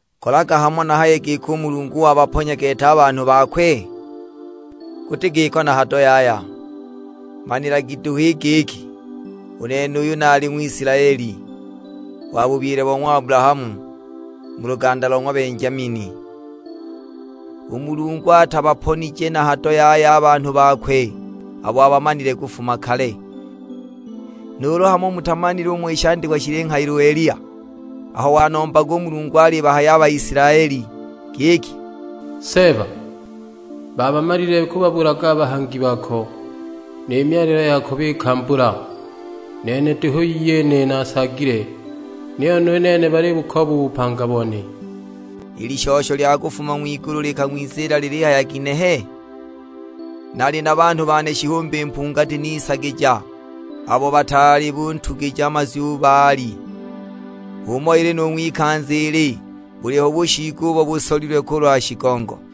Kolaga hamo nahaye giki u Mulungu wabaponya gete a banhu bakwe? Guti giko na hado yaya! Manilagi duhu i giki, u nene uyu nali Ng'wisilaeli, wa bubyile bo ng'wa Abulahamu, mu luganda lo ng'wa Benjamini. U Mulungu atabaponije na hado yaya a banhu bakwe abo abamanile kufuma kale. Nuulu hamo mutamanile umo shandikwa shilinghayila Eliya, aho wanombaga Mulungu alibahaya Baisilaeli; giki, "Seeba, baabamalile kubabulaga a bahangi bako, ni myalilo yako bikambagula, nene duhu iyene naasaagile; niyo nu nene balibukooba u bupanga bone!" I lishosho lya kufuma ng'wigulu likang'wiziila lilihaya ginehe? "Nali na banhu bane shihumbi mpungati nisaagija, abo bataali kuntugija mazwi Baali!" H'umo ili nu ng'wikanza ili, buliho bushiigo ubo busolilwe kulwa shigongo.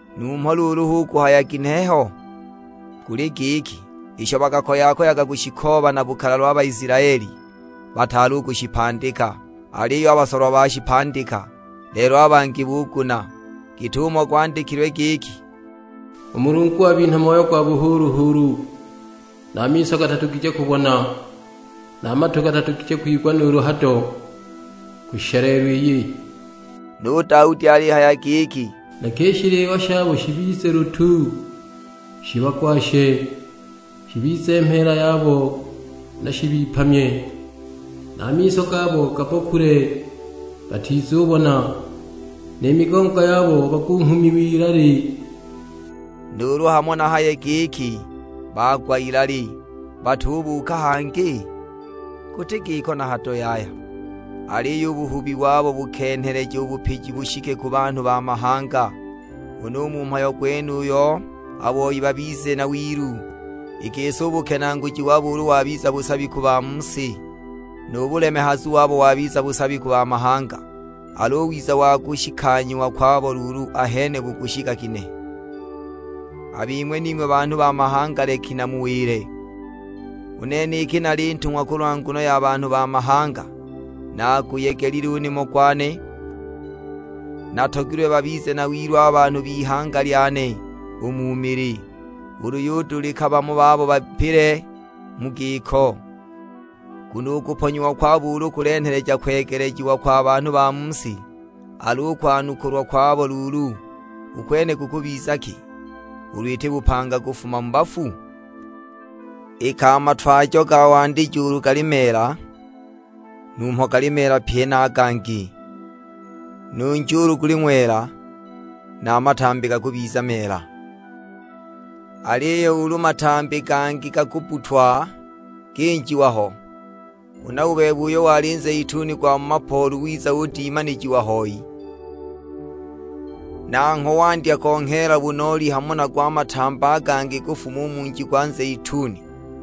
Numho luulu hu kuhaya ginehe ho? Guli giki, isho bakakoya-koyaga kushikooba na bukalalwa a Baisilaeli, bataali u kushipandika. Aliyo a basolwa bashipandika, lelo a bangi buguna. Git'umo gwandikilwe giki, "U Mulungu wabinha moyo gwa buhuulu-huulu, na miso gatadugije kubona, na matu gatadugije kwigwa nuulu hado, kushisha lelo iyi!" Nu Daudi alihaya giki, "Leka i shiliwa shabo shibize lutu, shibagwashe; shibize mheela yabo na shibipamye! Na a miso gabo gabbokule batizubona, ni migongo yabo bagunghumiwe ilali!" Nuulu hamo nahaye giki bagwa ilali, batubuuka hangi? Guti giko na hado yaya! Aliyo u buhubi wabo bukenheleja u bupiji bushike ku banhu ba mahanga, huna u mu mhayo gwenuyu a boi babize na wilu. I gisi u bukenaaguji wabo ulu wabiza busabi ku ba mu si, nu bulemehazu wabo wabiza busabi ku mahanga, al'u wiza wa kushikanyiwa kwabo luulu ahene bukushika ginehe! A bing'we ning'we banhu ba mahanga leki namuwile, u nene iki nali ntung'wa kulwa nguno ya banhu ba mahanga, naguyegelile u nimo gwane. Natogilwe babize na wilu a banhu b'ihanga lyane u mu mili, ulu yudulika bamo babo bapile mu giko. Nguno u kuponyiwa kwabo ulu kulenheleja kwegelejiwa kwa banhu ba mu si; al'u kwanukulwa kwabo luulu u kwene kukubiza ki, ulu iti bupanga kufuma mu bafu? Iki a matwajo ga wandijo ulu gali meela, numho gali meela pye na a gangi, nu nji ulu guli ng'wela, na a matambi gakubiza meela. Aliyo ulu matambi gangi gakabbutwa ginjiwa ho, huna u bebe uyo wali nzeituni gwa mu mapoolu wiza udimanijiwa hoi, nangho wandya kongheela bunooli hamo nago a matambi a gangi kufuma u mu nji gwa nzeituni,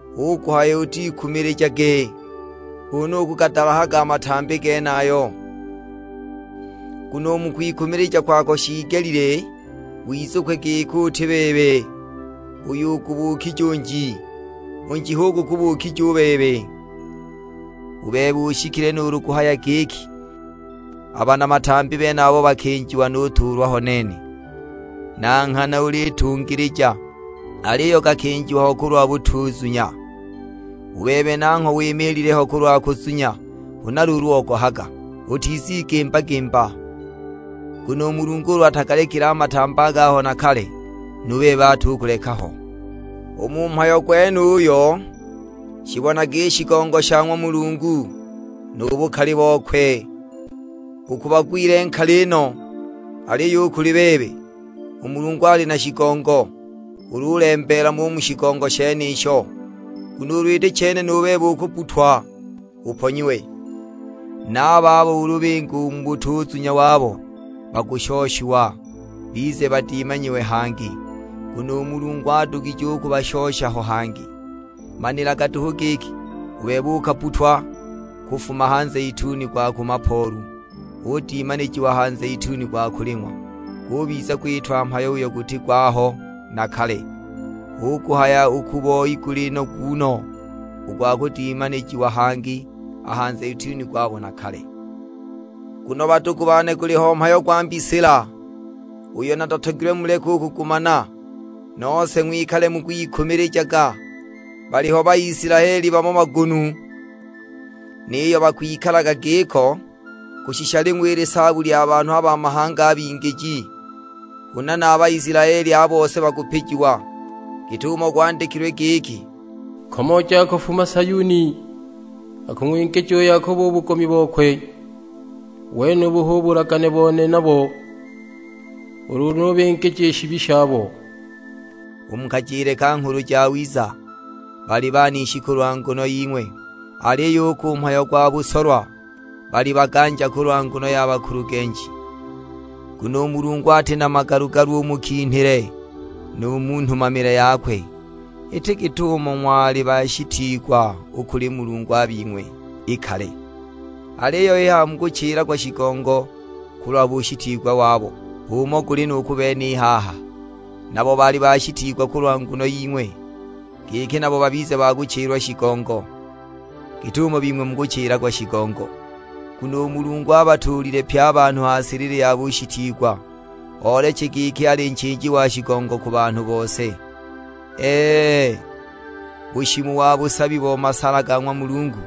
hu kuhaya utikumilijage kunu ukugadalahaga a matambi genayo. Nguno u mu kwikumilija kwako shiigelile wizukwe giki uti bebe uyo ugubukije u nji; u nji hu gukubukije u bebe. U bebe ushikile nuulu kuhaya giki, "A bana matambi benabo bakinjiwa nutuulwa ho nene!" Na nghana ulitungilija, aliyo gakinjiwa ho kulwa butuzunya; u bebe nangho wimiilile ho kulwa kuzunya, huna luulu ogohaga; utizigimba-gimba. Nguno u Mulungu ulu atagalekile a matambi a gaho na kale, nu bebe atukuleka ho! U mu mhayo gwenuyo shibonage i shigongo sha ng'wa Mulungu, nu bukali bokwe; u ku bagwile nkali no. Aliyo u kuli bebe, u Mulungu ali na shigongo, ulu ulembeela mo u mu shigongo shenisho. Nguno ulu iti chene nu bebe ukubbutwa uponyiwe! Na a babo ulu binga u mu butuzunya wabo bakushoshiwa, bize badimanijiwe hangi; nguno u Mulungu adugije u kubashosha ho hangi. Manilaga duhu giki, u bebe ukabbutwa kufuma ha nzeituni gwa ku mapoolu, udimanijiwa ha nzeituni gwa kuling'wa, gubiza gwitwa mhayo uyo guti gwaho na kale; hu kuhaya u ku boi guli nogu no u gwa kudimanijiwa hangi a ha nzeituni gwabo na kale! Nguno badugu bane guliho mhayo gwa mbisila, uyo natatogilwe muleke u kugumana, nose ng'wikale mukwikumilijaga. Baliho Baisilaeli bamo bagunu, niyo bakwikala giko kushisha ling'we i lisaabu lya banhu ba mahanga a bingiji. Huna na a Baisilaeli a bose bakupijiwa, git'umo gwandikilwe giki, "Nkomooji akufuma Sayuni, akung'wingija u Yakobo u bugomi bokwe. U wenubu hu bulagane bone nabo, ulu nubingija i shibi shabo." U mu kajile ka Nghulu Jawiza, bali banishi kulwa nguno ying'we, aliyo u ku mhayo gwa busolwa, bali baganja kulwa nguno ya bakulugenji. Nguno u Mulungu ati na magalu-galu u mu kinhile nu mu nhumamile yakwe. Ili git'umo ng'wali bashitiigwa u kuli Mulungu a bing'we i kale; aliyo i haha mukuchilagwa shigongo, kulwa bushitiigwa wabo. H'umo guli nu ku bene i haha, nabo bali bashitiigwa kulwa nguno ying'we, giki nabo babize ba kuchilwa shigongo, git'umo bing'we mukuchilagwa shigongo. Nguno u Mulungu abatuulile pye a banhu ha silili ya bushitiigwa, ooleche giki ali nchiiji wa shigongo ku banhu bose. Ee, bushimu wa busabi bo masala ga ng'wa Mulungu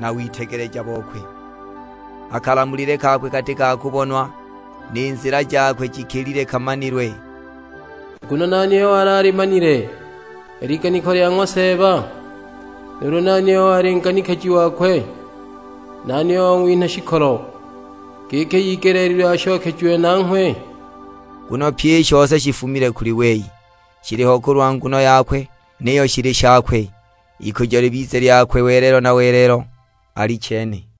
na witegeleja bokwe; a kalamulile kakwe kati ka kubonwa, ni nzila jakwe jikilile kamanilwe! "Nguno nani uyo wali alimanile i liganiko lya ng'wa Seeba? Nuulu nani uyo wali nganikiji wakwe? Nani uyo wang'winha shikolo, giki igeleelilwe ashokejiwe nanghwe?" Nguno pyi i shose shifumile kuli wei, shiliho kulwa nguno yakwe, niyo shili shakwe. Ikujo libize lyakwe welelo na welelo: Alichene!